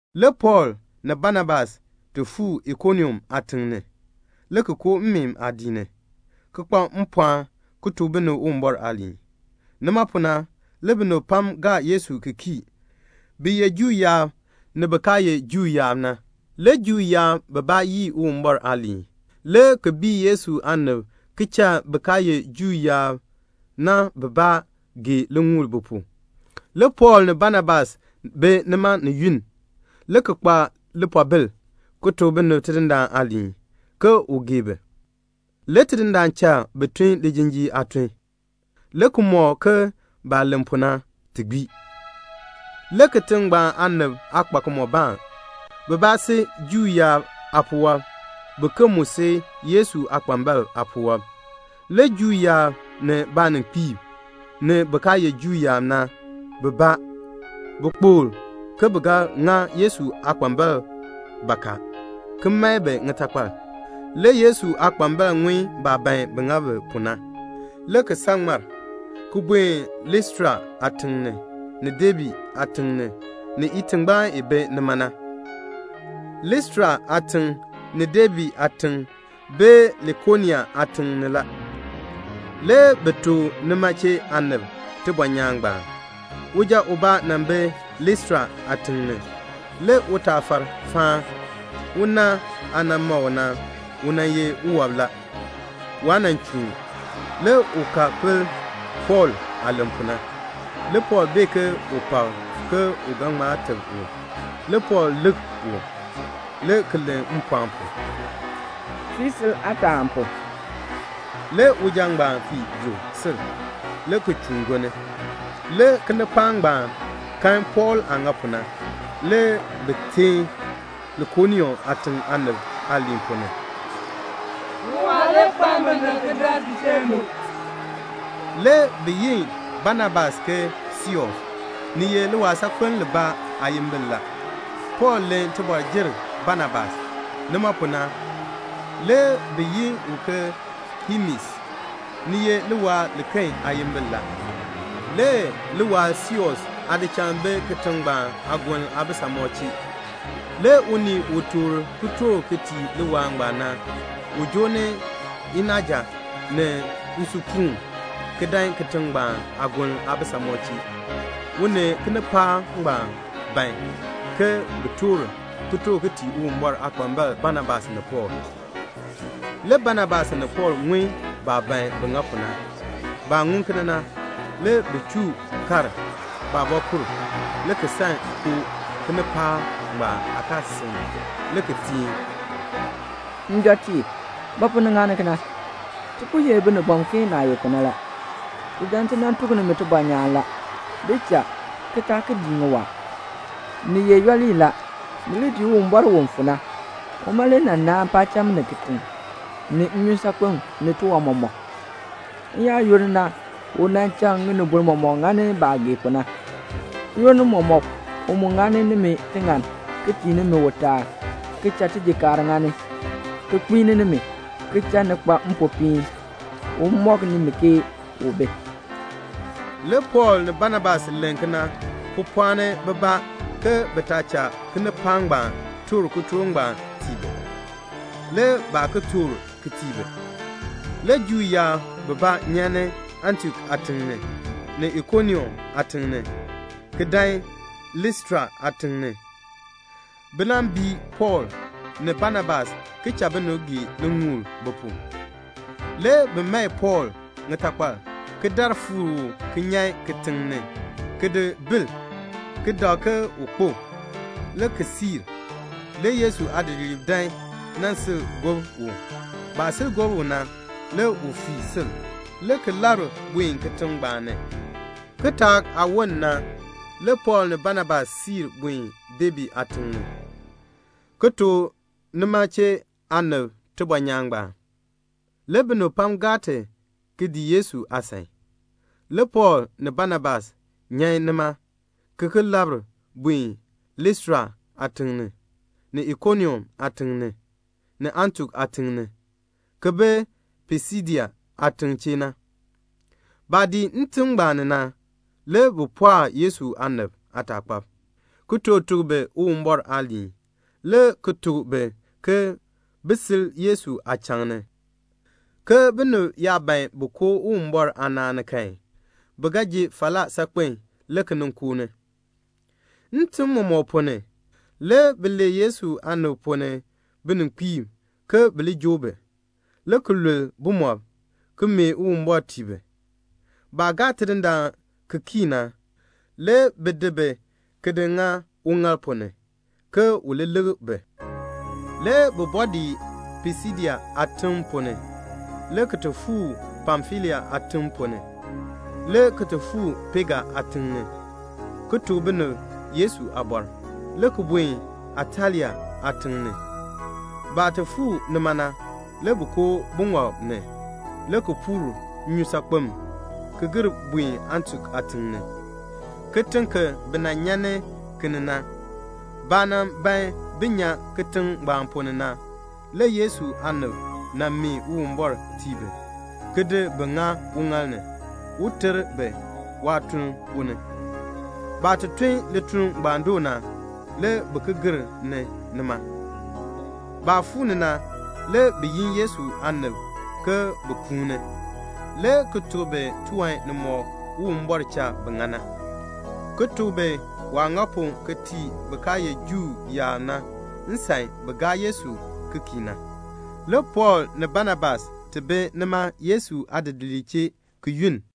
Le Pɔɔl ni Banabas ti fuu Ikonium aatiŋ ni, le ki koo mmeen aadiik ni, ki kpa mpɔɔn ki tuk binib Uwumbɔr aaliin. Nima pu na le binib pam gaa Yesu ki kii, bin ye Juu yaab, ni bin kaa ye Juu yaab na. Le Juu yaab bibaa yii Uwumbɔr aaliin, le ki bii Yesu aanib ki cha bin kaa ye Juu yaab na bibaa gee liŋuul bi pu. Le Pɔɔl ni Banabas bi nima ni yunn, le ki kpa lipoobil ki tuk binib Tidindaan aaliin, ke u gee bi. Le Tidindaan cha bi tun lijinjiir aatun, le ki mɔk ke baah len pu na, ti gbii. Le kitiŋ ngbaan aanib aa kpa kimɔbaan. Bibaa si Juu yaab aapuwɔb, biken mu si Yesu aakpambalb aapuwɔb. Le Juu yaab ni baaninkpiib, ni bin kaa ye Juu yaab na bibaa, bi kpokl ke bi ga ŋa Yesu aakpambalb bakaa ki mae bi ŋitakpal. Le Yesu aakpambalb ŋun baah ban bin ŋa bi pu na. Le bi san ŋmar, ki buen Listra aatiŋ ni, ni Debe aatiŋ ni, ni itingbaan i bi nima na. Listra aatiŋ, ni Debe aatiŋ bi Likonia aatiŋ ni la. Le bi tuk nima chee aanib tibɔnyaan ngbaan. Uja ubaa nan bi Listra aatiŋ ni. Le utaafar faan. Una aah nan ma u na, u nan ye uwɔb la. Waa nan chuun. Le u ka pel Pɔɔl aah len pu na. Le Pɔɔl bee ke u pak ke u ga ŋma teb u. Le Pɔɔl lik u, le ki len mpɔɔn pu, "Fii sil aataa pu." Le uja ngbaan fii yuk sil, le ki chuun gonni. Le kinipaak ngbaan kan Pɔɔl aah ŋa pu na. Le bi teen Likonia aatiŋ aanib aaliin ponn ni, "Ŋiwaa le kpaln binib ki dan ti chee du." Le bi yi Banabas ke Seus. Ni ye liwaal saakpeln libaa aayimbil la. Pɔɔl len tibɔr jer Banabas. Nima pu na, le bi yi u ke Hemes. Ni ye liwaal liken aayimbil la. Le liwaal Seus aadichal bi kitiŋ ngbaan aagoln aabisamɔb chee. Le unii u toor kitork ki tii liwaal ngbaan na, u joo ni inaaja ni nsupuun ki dan kitiŋ ngbaan aagoln aabisamɔb chee. U ni kinipaak ngbaan ban ke bin toor kitork ki tii Uwumbɔr aakpambalb Banabas ni Pɔɔl. Le Banabas ni Pɔɔl ŋun baah ban bin ŋa pu na. Baah ŋun kena na, le bi chuu kar baabɔkur, le ki san koo kinipaak ngbaan aakaasisik ni, le ki teen, "Njɔtiib, ba pu ni ŋani kena? Ti po ye binibɔm ke naah ye pu na la. Ti dan ti nan tuk nimi tibɔnyaan la. Di cha, ki taa ki dii ŋiwaa. Ŋi ye yooli la. Ni li dii Uwumbɔr u fu na. Uma le nan naan paacham ni kitiŋ, ni nnyusaakpem, ni tiwan mɔmɔk. N-yaayoonn na u nan cha ŋinibol mɔmɔk ŋani baah gee pu na. N-yoonn mɔmɔk u mu ŋani nimi tiŋann, ki tii nimi utaal, ki cha tijikaar ŋani, ki kpiini nimi, ki cha ni kpa mpopiin, un mɔk nimi ke u bi." Le Pɔɔl ni Banabas len kena ki pɔɔni bibaa ke bi taa cha kinipaak ngbaan toor kitork ngbaan tii bi. Le baa ki toor ki tii bi. Le Juu yaab bibaa nyan ni Antiok aatiŋ ni, ni Ikonium aatiŋ ni, ki dan Listra aatiŋ ni, bi nan bii Pɔɔl ni Banabas ki cha binib gee liŋuul bi pu. Le bi mae Pɔɔl ŋitakpal, ki dar fuuk u ki nyan kitiŋ ni, ki di bil, ki dak ke u kpo, le ki cha. Le Yesu aadidiliib dan nan sil gob u. Baah sil gob u na, le u fii sil, le ki labr buen kitiŋ ngbaan ni. Le kitaak aah woln na, le Pɔɔl ni Banabas siir buen Debe aatiŋ ni, ki tuk nima chee aanib tibɔnyaan ngbaan. Le binib pam gaa ti ki dii Yesu aasan. Le Pɔɔl ni Banabas nyan nima ki ki labr buen Listra aatiŋ ni, ni Ikonium aatiŋ ni, ni Antiok aatiŋ ni, ki bi Pisidia aatiŋ chee na. Baah dii ntim ngbaan ni na, le bi pɔɔk Yesu aanib aataakpab, ki toor tuk bi Uwumbɔr aaliin, le ki tuk bi ke bin sil Yesu aachaŋ, ke binib yaa ban bin koo Uwumbɔr aanaan ni kan, bi ga ji falaa saakpen le ki nin koo ni. Ntim mɔmɔk ponn ni, le bi lee Yesu aanib ponn ni bininkpiib ke bi li joo bi, le ki lul bumɔb, ki mee Uwumbɔr tii bi. Baah gaa Tidindaan ki kii na, le bi di bi ki di ŋa uŋaal ponn ni, ke u li lik bi. Le bi bɔɔ dii Pisidia aatim ponn ni, le ki ti ki fuu Pamfilia aatiŋ ponn ni, le ki ti fuu Pega aatiŋ ni, ki tuk binib Yesu aabɔr, le ki buen Atalia aatiŋ ni. Baah ti fuu nima na, le bi koo buŋɔb ni, le ki puur nnyusaakpem gir buen Antiok aatiŋ ni, kitiŋ ki bi nan nyan ni ki ni na. Baah nan ban bin nyan kitiŋ ngbaan ponn ni na, le Yesu aanib nan mee Uwumbɔr tii bi, ki di bi ŋa uŋaal ni, un ter bi waatuln ponn ni. Baah ti tun lituln ngbaan doo na, le bi ki gir ni nima. Baah fuu ni na, le bi yin Yesu aanib ke bin kuuni, le ki tuk bi tiwan nimɔk Uwumbɔr cha bi ŋa na, ki tuk bi waah ŋa pu ki tii bin kaa ye Juu yaab na nsan bin gaa Yesu ki kii na. Le Pɔɔl ni Banabas ti bi nima Yesu aadidiliib chee, ki yunn.